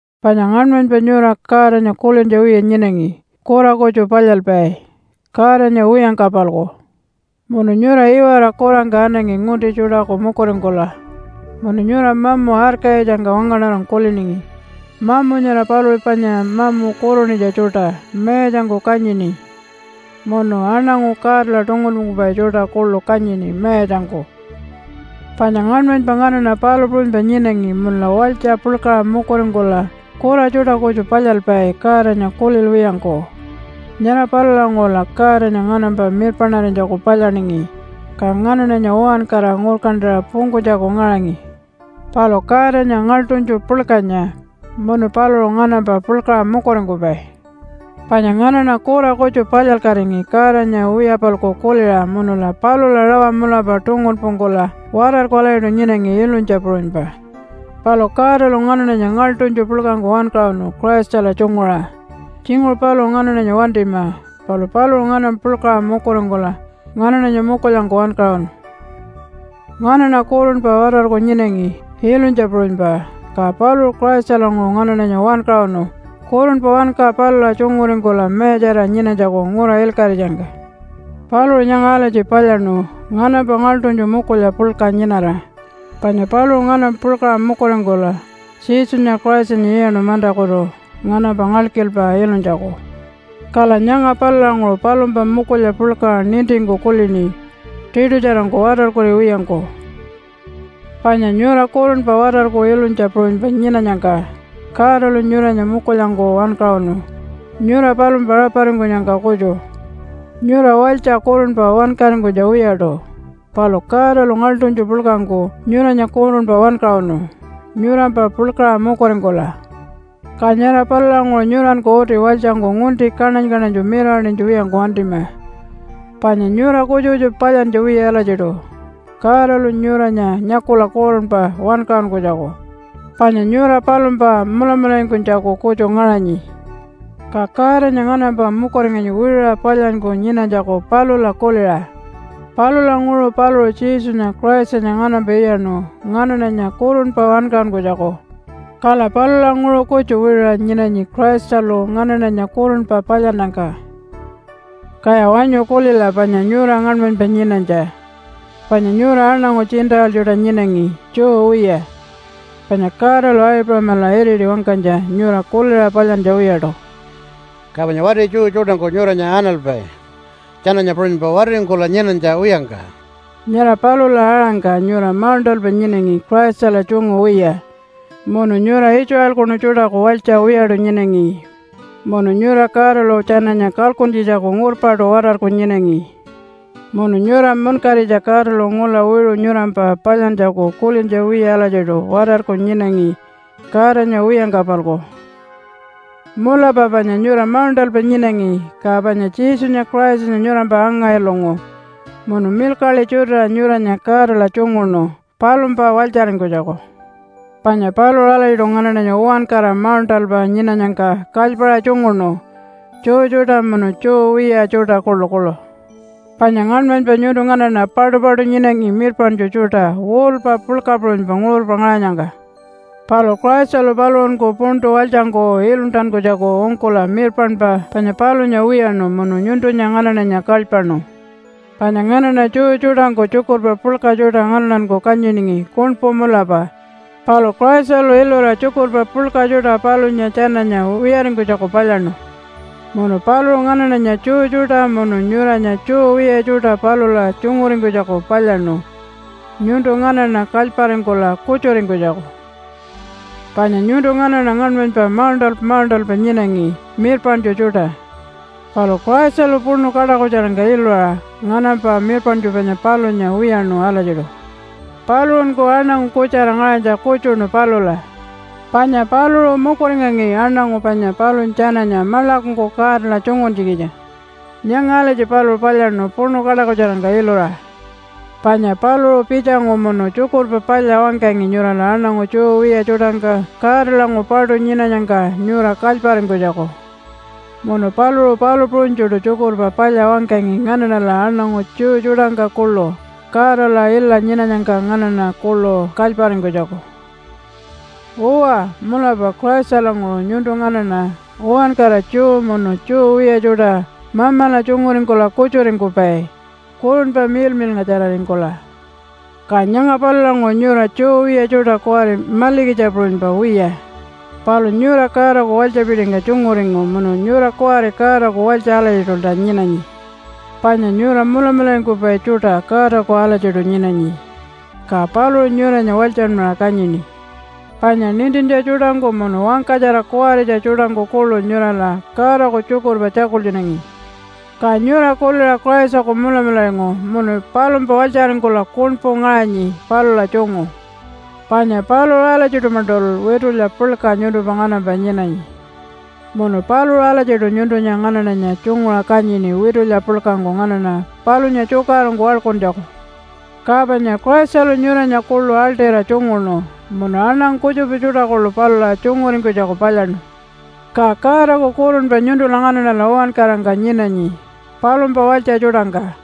Panya ngaṉmanypa nyura Godanya kulintja wiya nyinangi kura kutju palyalpai, Godanya wiyangka-palku. Munu nyura iwara kurangka anangi ngunti tjuṯaku mukuringkula munu nyura mamu arkayitjangka wangaṉarangku kuliningi. Mamu nyara paluṟu panya mamu kurunitja tjuṯa mayatjangku kanyini munu aṉangu Godala tungunpungkupai tjuṯa kuḻu kanyini mayatjangku. Panya ngaṉmanypa nganaṉa palu puṟunypa nyinangi munula walytja puḻkaṟa mukuringkula kura tjuṯa kutju palyalpai Godanya kulilwiyangku. Nyara palulanguṟula Godanya nganampa mirpaṉarinytjaku palyaningi, ka nganaṉanya uwankara ngurkantaṟa pungkunytjaku ngaṟangi. Palu Godanya ngaḻṯunytju puḻkanya munu paluṟu nganampa puḻkaṟa mukuringkupai. Panya nganaṉa kura kutju palyalkatingi Godanya wiya-palku kuliṟa munula palula rawa mulapa tungunpungkula watarku alatjiṯu nyinangi ilunytja puṟunypa. Palu Godalu nganaṉanya ngaḻṯunytju puḻkangku wankaṟunu Christala tjunguṟa. Tjinguṟu paluṟu nganaṉanya wantima, palu paluṟu nganampa puḻkaṟa mukuringkula nganaṉanya mukulyangku wankaṟunu. Nganaṉa kurunpa watarku nyinangi ilunytja puṟunypa, ka paluṟu Christalanguṟu nganaṉanya wankaṟunu kurunpa wanka palula tjunguringkula mayatjarira nyinanytjaku ngura ilkaṟitjangka. Paluṟu nyanga alatji palyaṉu nganampa ngaḻṯunytju mukulya puḻka nyinara, panya paluṟu nganampa puḻkaṟa mukuringkula Jesunya Christanya iyaṉu mantakutu nganampa ngalkilpa ilunytjaku. Kala nyanga palulanguṟu palumpa mukulya puḻka nintingku kulini, tiṯutjarangku watarkuriwiyangku. Panya nyura kurunpa watarku ilunytja puṟunypa nyinanyangka Godalu nyuranya mukulyangku wankaṟunu, nyura palumpa raparingkunyangka kutju. Nyura walytja kurunpa wankaringkunytja wiyaṯu, palu Godalu ngaḻṯunytju puḻkangku nyuranya kurunpa wankaṟunu, nyurampa puḻkaṟa mukuringkula. Ka nyara palulanguṟu nyuranku uti walytjangku ngunti kaṉany-kaṉanytju mirawaṉinytja wiyangku wantima, panya nyura kutjupa kutjupa palyantja wiya alatjiṯu Godalu nyuranya nyakula kurunpa wankaṟunkunytjaku, panya nyura palumpa mulamularingkunytjaku kutju ngaṟanyi. Ka Godanya nganampa mukuringanyi wiṟuṟa palyanyku nyinanytjaku palula kuliṟa. Palulanguṟu paluṟu Jesunya Christanya nganampa iyaṉu nganaṉanya kurunpa wankaṟunkunytjaku. Kala palulanguṟu kutju wiṟuṟa nyinanyi Christalu nganaṉanya kurunpa palyannyangka. Kaya wanyu kulila panya nyura ngaṉmanypa nyinanytja. Panya nyura aṉangu Gentile tjuṯa nyinangi Jew wiya, panya Godalu Aipuṟamala iriti wangkanytja nyura kuliṟa palyantja wiyaṯu. (Ka panya wati Jew tjuṯangku nyuranya analpai tjananya puṟunypa watiringkula nyinanytja wiyangka.) Nyara palula aṟangka nyura mauṉṯalpa nyinangi Christala tjungu wiya, munu nyura Israelkunu tjuṯaku walytja wiyaṯu nyinangi. Munu nyura Godalu tjananya kalkuntjitjaku ngurpaṯu watarku nyinangi. Munu nyura munkaritja Godalu ngula wiṟu nyurampa palyantjaku kulintja wiya alatjiṯu watarku nyinangi, Godanya wiyangka-palku. Mulapa panya nyura mauṉṯalpa nyinangi, ka panya Jesunya Christanya nyurampa anga-ilungu munu milkaḻi tjutiṟa nyuranya Godala tjunguṉu palumpa walytjaringkunytjaku. Panya paluṟu alatjiṯu nganaṉanya uwankara mauṉṯalpa nyinanyangka kalypaṟa tjunguṉu Jew tjuṯa munu Jew wiya tjuṯa kuḻukuḻu. Panya ngaṉmanypa nyuntu nganaṉa paṯupaṯu nyinangi mirpaṉtju tjuṯa wall-pa puḻka puṟunypa nguṟurpa ngaṟanyangka. Palu Christalu paluṟunku puntu walytjangku iluntankunytjaku ungkula mirpaṉpa panya palunya wiyaṉu munu nyuntunya nganaṉanya kalypaṉu. Panya nganaṉa Jew tjuṯangku tjukurpa puḻka tjuṯa nganaṉanku kanyiningi kuṉpu mulapa, palu Christalu ilura tjukurpa puḻka tjuṯa palunya tjananya wiyaringkunytjaku palyaṉu. Munu paluṟu nganaṉanya Jew tjuṯa munu nyuranya Jew wiya tjuṯa palula tjunguringkunytjaku palyaṉu nyuntu nganaṉa kalyparingkula kutjuringkunytjaku. Panya nyuntu nganaṉa ngaṉmanypa mauṉṯalpa mauṉṯalpa nyinangi mirpaṉtju tjuṯa. Palu Christalu puṉu kaṯakutjarangka ilura nganampa mirpaṉtju panya palunya wiyaṉu alatjiṯu. Paluṟunku aṉangu kutjara ngaṟanytja kutjuṉu palula, panya paluṟu mukuringangi aṉangu panya palunya tjananya maḻakungku Godala tjunguntjikitja. Nyanga alatji paluṟu palyaṉu puṉu kaṯakutjarangka ilura. Panya paluṟu pitjangu munu Tjukurpa Palya wangkangi nyurala aṉangu Jew wiya tjuṯangka Godalanguṟu paṯu nyinanyangka nyura kalyparingkunytjaku. Munu paluṟu palu puṟunytjuṯu Tjukurpa Palya wangkangi nganaṉala aṉangu Jew tjuṯangka kuḻu Godala ila nyinanyangka nganaṉa kuḻu kalyparingkunytjaku. Uwa, mulapa Christalanguṟu nyuntu nganaṉa uwankara Jew munu Jew wiya tjuṯa Mamala tjunguringkula kutjuringkupai Kurunpa Miḻmiḻngatjararingkula. Ka nyanga palulanguṟu nyura Jew wiya tjuṯa kuwari malikitja puṟunypa wiya, palu nyura Godaku walytjapitingka tjunguringu munu nyura kuwari Godaku walytja alatjiṯulta nyinanyi. Panya nyura mulamularingkupai tjuṯa Godaku alatjiṯu nyinanyi. Ka paluṟu nyuranya walytjanmaṟa kanyini. Panya nintintja tjuṯangku munu wangkatjara kuwaritja tjuṯangku kuḻu nyurala Godaku tjukurpa tjakultjunangi. Ka nyura kuliṟa Christaku mulamularingu munu palumpa walytjaringkula kuṉpu ngaṟanyi palula tjungu. Panya paluṟu alatjiṯu-maṉṯul witulya puḻka nyuntumpa nganampa nyinanyi. Munu paluṟu alatjiṯu nyuntunya nganaṉanya tjunguṟa kanyini witulya puḻkangku nganaṉa palunya tjukaṟurungku waḻkuntjaku. Ka panya Christalu nyuranya kuḻu aḻṯira tjunguṉu munu aṉangu kutjupa tjuṯa kuḻu palula tjunguringkunytjaku palyaṉu. Ka Godaku kurunpa nyuntula nganaṉala uwankarangka nyinanyi, palumpa walytja tjuṯangka.